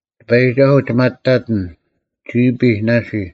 ᑎᐸᔨᒋᒐᓱᐤ, ᒋ ᒪᑕᑎᓐ: ᒋᐱᔾ ᓇᓯ;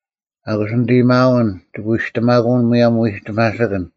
ᐊᑯᔅ ᓂᑦ ᐊᔭᒥᐊᓐ ᒋᑭ ᐎᔨᔅᑎᒪᑯᐅᓐ ᒧᔭᒻ ᐎᒋᒪᓯᑭᓐ;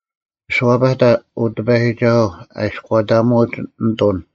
ᐊᓱᐛᐸᑕ, ᐅ ᑎᐸᔨᒋᒐᓱᐤ, ᐊ ᐃᔎᑕᒧᐅᒡ ᓂᑐᓐ;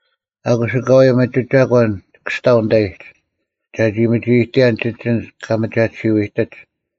ᐊᑯᔅ ᐊᑲᐎᔾ ᒥᒋ ᒐᒂᓐ ᒋᑭ ᐊᔅᑕᐤ ᓂᑕᐃᒡ, ᒐᒋ ᒥᒋᐃᑎᔭᓐ ᒋᒡ ᐊᓐᒡ ᑲ ᒥᒐᑎᓯᐤ ᐃᑎᒡ;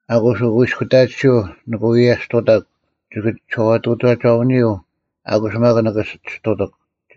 ᐊᑯᔅ ᐅᑯᐃᔅᑯᑕᑎᓯᐤ ᓂᑭ ᐎᔭᔅᑐᑕᒄ; ᒋᑭ ᒋᓴᐛᑐᑕᒐᐅᓂᐎᔪᐤ; ᐊᑯᔅ ᒪᒃ ᓂᑭ ᒋᔅᑐᑎᒄ;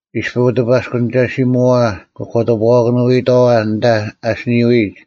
ᐃᔅᐱ ᐅᑲᑎᐸᔅᑯᓂᒐᓯᒧᐛᐛ ᑭ ᒂᑎᐱᐛᐸᐊᑭᓄᐎᔨᑥᐛ ᐊᓐᑕ ᐊ ᐊᓯᓂᐅᔨᒡ,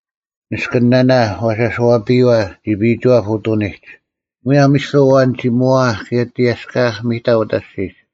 “ᓂᔅᑭᓂᓇᓇ ᐛᓴᔄᐱᔪᐛ ᒋᐱᐃᒋᐛᑉ ᐅᑐᓂᒡ, ᒧᔭᒻ ᐃᔅᐱ ᐊᐛᓐ ᒋᒪᐊᐧᒃ ᑭᔭ ᑎᔭᔅᑲᐊᐧᒃ ᒥᑕ ᐅᑕ ᐊᔅᒋᒡ᙮”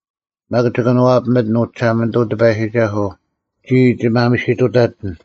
ᒪᒃ ᒋ ᑭᓄᐛᐱᒥᑎᓐ, ᐅ ᒋᓴᒪᓂᑐᐤ ᑎᐸᔨᒋᒐᓱᐤ᙮ ᒋᔾ ᒋ ᒪᒥᓯᑐᑕᑎᓐ;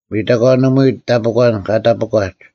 ᒥᑕᒂᓂᒧᐎ ᑕᐱᒂᓐ ᑲ ᑕᐱᒂᒡ,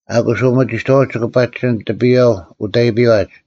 ᐊᑯᔅ ᐅᒥᒋᑥᐅᒡ ᒋᑭ ᐸᒋᓯᓐᒡ ᑎᐱᔨᐛ ᐅᑦ ᐊᐃᐱᐛᒡ,